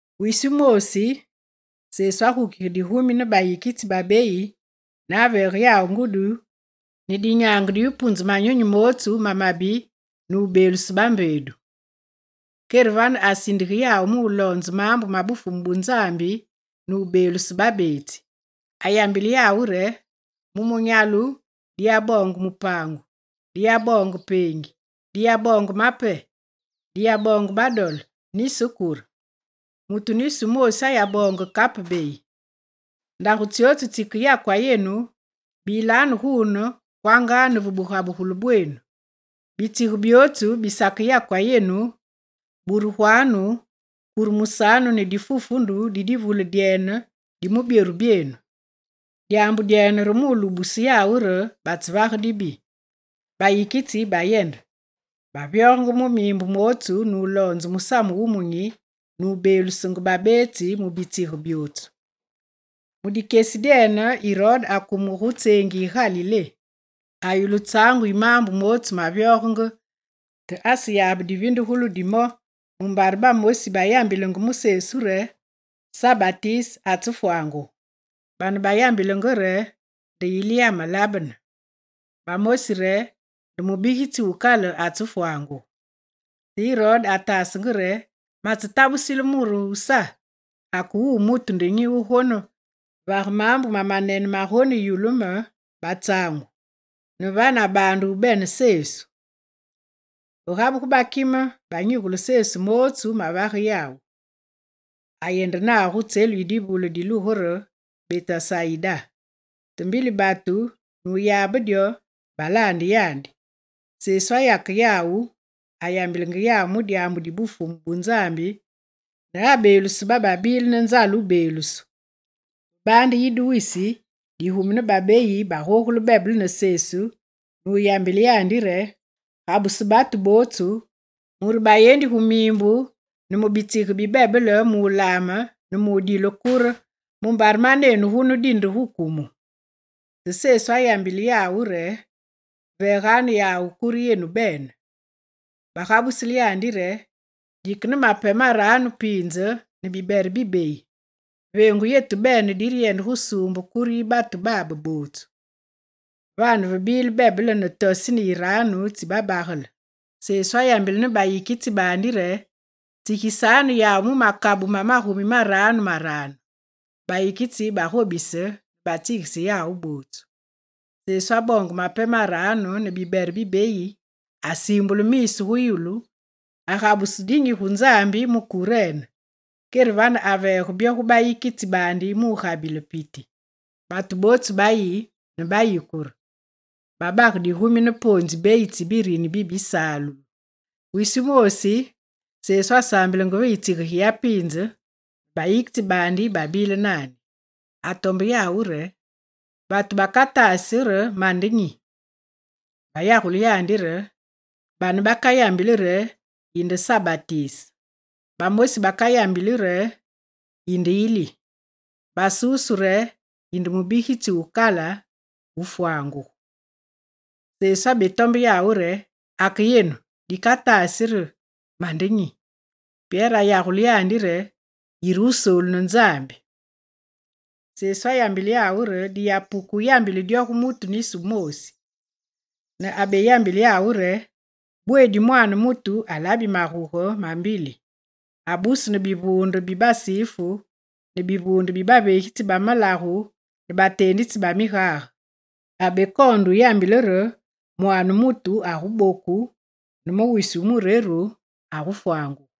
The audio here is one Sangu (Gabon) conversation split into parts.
Wisi wumoosi, Sesu agukige digumi ne bayikitsi babeyi ne aveege yawu ngudi ne dinyaange di wupunze manyunyi mootsu mamabi ne wubeeluse bambeedu. Kere vane asindige yawu muloonze maambu ma Bufumu bu Nzambi ne mubeeluse babeetsi. Ayambile yawu re: «Mu munyalu diyaboonge mupaangu, diyaboonge peengi, diyaboonge mape, diyaboonge badole nisi kure. Mutu nisi wumoosi ayaboonge kape beyi. Ndagu tsyotsu tsikeyakwa yenu, bilanu guune kwanga ne ve bugabugulu bwenu. Bitsige byootsu bisakeyakwa yenu, buruganu, kuremusanu ne difufundu di divule dyene di mu byoru byenu. Dyaambu dyene re mulubuse yawu re batsevage dibi.» Bayikitsi bayende, bavyogenge mu miimbu mootsu nuloonzenge musamu wumunyi nubeelusenge babeetsi mu bitsige byootsu. Mu dikyesi dyene, Irode akumenge gu tseengi yi Galilé. Ayulu tsaangu yi maambu mootsu mavyogenge te aseyabe divindugulu di mo mumbare bamosi bayambilenge mu Sesu re: «Sa Batise atsefwangugu.» Baane bayambilenge re nde Ili amelabene, bamosi re: «Nde mubigitsi wukale atsefwangugu.» Te Irode ataasenge re: «Matsetabulise muru wu Sa. Ake wuwu mutu nde nyi wugonevage maambu mamanene magoneyulu me batsaangu?» Ne vane abaande wubene Sesu. Ve gabugu Bakime banyigule Sesu mootsu mavage yawu. Ayende nawu gu tselu yi divule dilugu re Betesayida. Te mbili batu nuyabe dyo, balaande yandi. Sesu ayake yawu, ayambilenge yawu mu dyaambu di Bufumu bu Nzambi ne abeeluse bababile ne nzale wubeelusu. Ve baande yide wisi digumi ne babeyi bagogule bebele ne Sesu ne wuyambile yandi re: «Gabuse batu bootsu mure bayendi gu miimbu ne mu bitsige bi bebele mulaame ne mudile kure, mumbare manenu gunu dike gu kumu.» Te Sesu ayambile yawu re: «Veeganu yawu kure yenu bene.» Bagabusile yandi re: «Dike ne mape maranu piinze ne bibere bibeyi. Veengu yetu bene direyende gusuumbe kure yi batu babe botswu.» Vane vebile bebele ne tosini yiraanu tsi babagele. Sesu ayambile ne bayikitsi baandi re: «Tsigisanu yawu mu makabu ma magumi maranu maranu.» Bayikitsi bagobise ne batsigise yawu bootsu. Sesu aboonge mape maranu ne bibere bibeyi, asiimbule miisu gu yulu, agabuse dinyi gu Nzambi mu kurene. Kere vane aveege byo gu bayikitsi baandi mu gabile piti. Batu bootsu bayi ne bayikure. Babage digumi ne poonzi beyi tsi birini bisalulu. Wisi wumoosi, Sesu asaambilenge ve yitsige giyapiinze ne bayikitsi baandi babile naandi. Atombe yawu re: «Batu bakataasi re mande nyi?» Bayagule yandi re: «Bane bakayambile re yinde Sa Batise. Bamosi bakayambili re yinde Ili. Basusu re yinde mubigitsi wu kale wufwangugu.» Sesu abetombe yawu re: «Ake yenu, dikatasi nde re mande nyi?» Pyere ayagule yandi re: «Yire Wusoolu ne Nzambi.» Sesu ayambile yawu re diyapuke wuyambile dyo gu mutu nisi wumoosi. Ne abeyambile yawu re: «Bweedi Mwaane mutu alabi maguge mambili, abusu ne bivuunde bi Basifu ne bivuunde bi baveegitsi ba malagu ne bateenditsi ba migage. Abekoonde yambile re Mwaane mutu aguboku ne mu wisi wu mureru, agufwangugu.»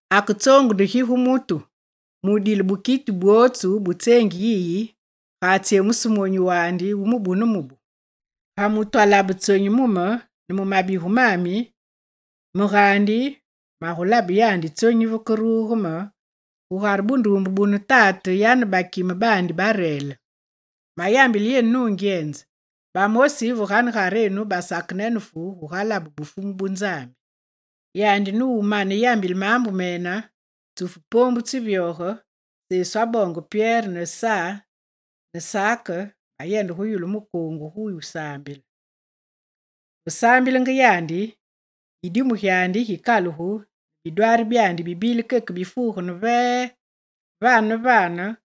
Ake tsoongu nde gi gu mutu mudile bukiti bwotsu butseengi yiyi, ga atsyemuse monyu wu mubu ne mubu? Ga mutu alabe tsonyi mu me ne mu mabigu mami, me gaandi magulabe yandi tsonyi vekeruge me gugare bunduumbe bune Tate yane bakime baandi barele. Mayambile yenu nungyenze, bamosi ve ganegarenu basakenenefu gugalabe Bufumu bu Nzambi.» Yandi numane yambile maambu mene, tsufu poombu nuvyoge, Sesu aboonge Pyere ne Sa ne Sake bayende gu yulu mukoongu gu wusaambile. Ve saambilenge yandi, yidimu gyandi gikalugu ne bidwaari byandi bibile keke bifuuge ne vee. Vane ne vane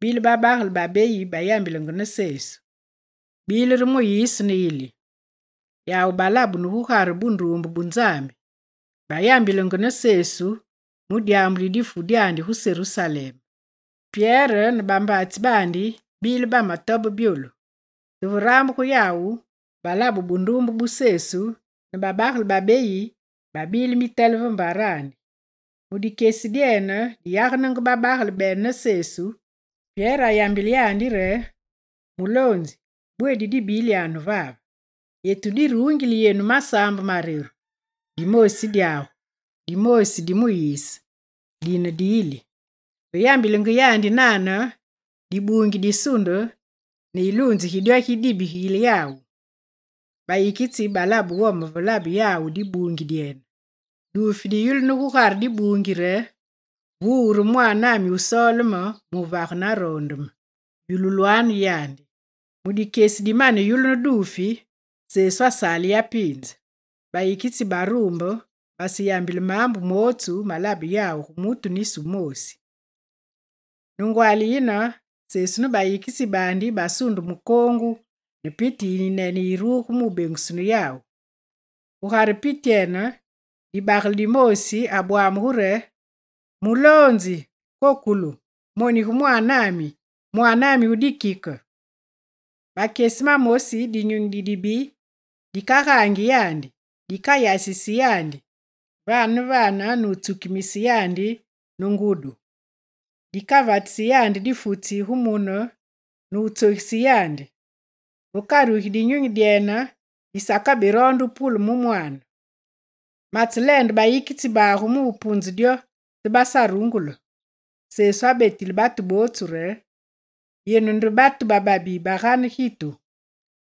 gubile babagele babeyi bayambilenge ne Sesu. Bile re Muyise ne Ili. Yawu balabunu gugare bunduumbe bu Nzambi. Bayambilenge ne Sesu mu dyaambu di difu dyandi gu Serusalem. Pyere ne bambaatsi baandi babile bametobe byolu; te ve rambuge yawu, balabe bunduumbe bu Sesu ne babagele babeyi babile mitele ve mbarandi. Mu dikyesi diyagene babagele bene ne Sesu, Pyere ayambile yandi re: «Muloonzi, bweedi dibilyanu vave. Yetu diruungili yenu masaambe mareru: dimoosi dyagu, dimoosi di Muyise, dine di Ili.» Ve yambilenge yandi nane, dibuungi disunde ne yiluunze gi dyo gidibigile yawu. Bayikitsi balabe wome ve labe yawu dibuungi dyene. Duufi diyulunu gugare dibuungi re: «Wuwu re Mwaanami wusoole me muvage naroonde me. Yululwanu yandi.» Mu dikyesi dimane yulunu duufi, Sesu asale yapiinze. Bayikitsi baruumbe, baseyambile maambu mootsu malabe yawu gu mutu nisi wumoosi. Ne ngwaali yine, Sesu ne bayikitsi baandi basunde mukoongu ne piti yiyinene yiruge mu bengusunu yawu. Gugare pityene, dibagele dimoosi abwamugu re: «Muloonzi, kokolu, monige mwaanami, mwaanami wu dikike! Makyesi mamosi dinyunyi didibi dikagaangi yandi. Dikayasisi yandi vane ne vane nutsukimise yandi ne ngudi. Dikavatisi yandi difutsi gu mune ne wutsogise yandi. Vekarugi dinyunyi dyene, disakaberoonde wupule mu mwaane. Matseleende bayikitsi bagu mu wupunze dyo, te basarungule.» Sesu abetile batu bootsu re: «Yenu nde batu bababi bagane gitu.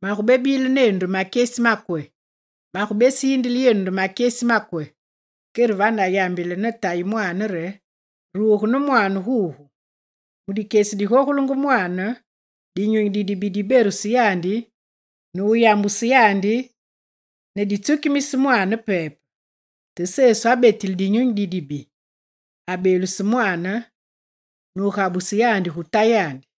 Magubebile nenu nde makyesi makwe? Magubesiindile yenu nde makyesi makwe?» Kere vane ayambile ne tayi mwaane re: «Ruge ne mwaanagu gugu.» Mu dikyesi digogule mwaane, dinyunyi didibi diberuse yandi ne wuyambuse yandi ne ditsukimise mwaane pepe. Te Sesu abetile dinyunyi didibi. Abeeluse mwaane nugabuse yandi gu tayandi.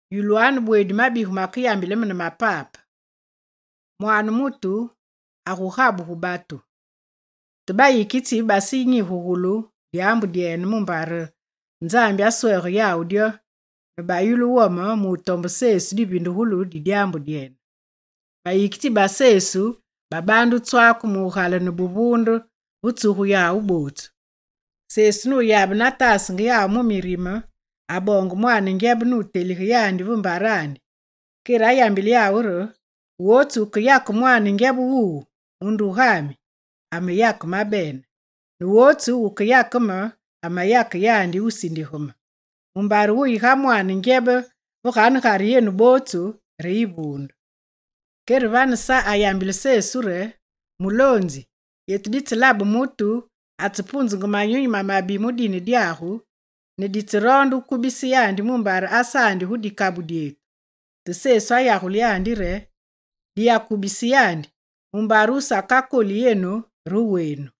«Yulwanu bweedi mabigu makeyambile me yenu ne mapape. Mwaane mutu agugabu gu batu.» Te bayikitsi basenyigugulu dyaambu dyene, mumbare Nzambi aswege yawu dyo ne bayulu wome mutombe Sesu divindugulu di dyaambu dyene. Bayikitsi ba Sesu babaande wutswake mugalene buvuunde ve tsugu yawu bootsu. Sesu nuyabe nataasenge yawu mu mirime, aboonge mwaane ngyebe, nutelige yandi ve mbarandi. Kere ayambile yawu re: «Wotsu wukeyake mwaane ngyebe wuwu mu ndugami, ameyake mabene ne wotsu wukeyake me, ameyake yandi wusindige me, mumbare wuyi ga mwaane ngyebe ve ganegare yenu bootsu, re yivuunde.» Kere vane Sa ayambile Sesu re: «Muloonzi yetu ditselabe mutu atsepunzenge manyunyi mamabi mu dine dyagu ne ditseroonde wukubise yandi mumbare asaandi gu dikabu dyetu.» Te Sesu ayagule yandi re: «Diyakubise yandi, mumbare wusakakoli yenu re wenu.»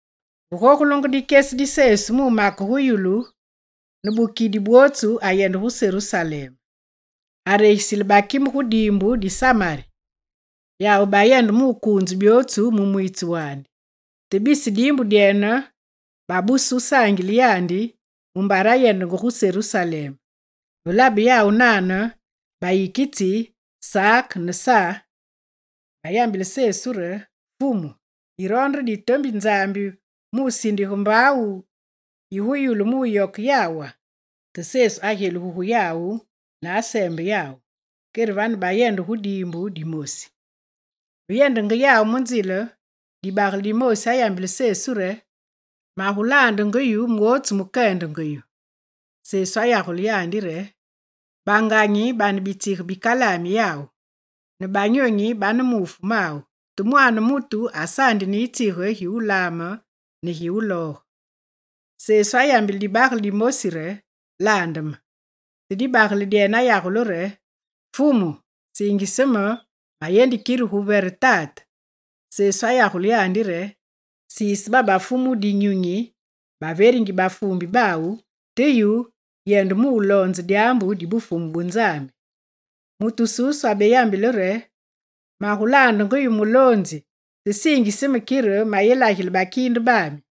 Ve gogulenge dikyesi di Sesu mumake gu yulu, ne bukidi bwotsu ayende gu Serusalem. Aregisile bakime gu diimbu di Samari. Yawu bayende mukuunze byootsu mu mwiitsu wandi. Te bisi diimbu dyene babuse wusaangile yandi mumbare ayendenge gu Serusalem. Ve labe yawu nane, bayikitsi Sake ne Sa bayambile Sesu re: «Fumu, yiroonde re ditombi Nzambi mu sindige mbaawu yi yulu mu wuyoke yawa?» Te Sesu agyelugu gu yawu ne aseembe yawu. Kere vane bayende gu diimbu dimosi. Ve yendenge yawu mu nzile, dibagele dimoosi ayambile Sesu re: «Magulaandenge yu mwotsu mukeyendenge yu.» Sesu ayagule yandi re: «Banganyi bane bitsige bikalaami yawu, ne banyonyi bane muufu mawu, te Mwaane mutu asaandi ne yitsige gi wulaame ne gi wulooge.» Sesu ayambile dibagele dimosi re: «Laande me.» Te dibagele dyene ayagule re: «Fumu, siingise me, mayendi kire gu yevere tate.» Sesu ayagule yandi re: «Siise babafu mu dinyunyi baveringi bafuumbi bawu, te yu, yende muloonze dyaambu di Bufumu bu Nzambi.» Mutu wususu abeyambile re: «Magulaandenge yu, Muloonzi, te siingise me kire mayelagile bakiinde baami.»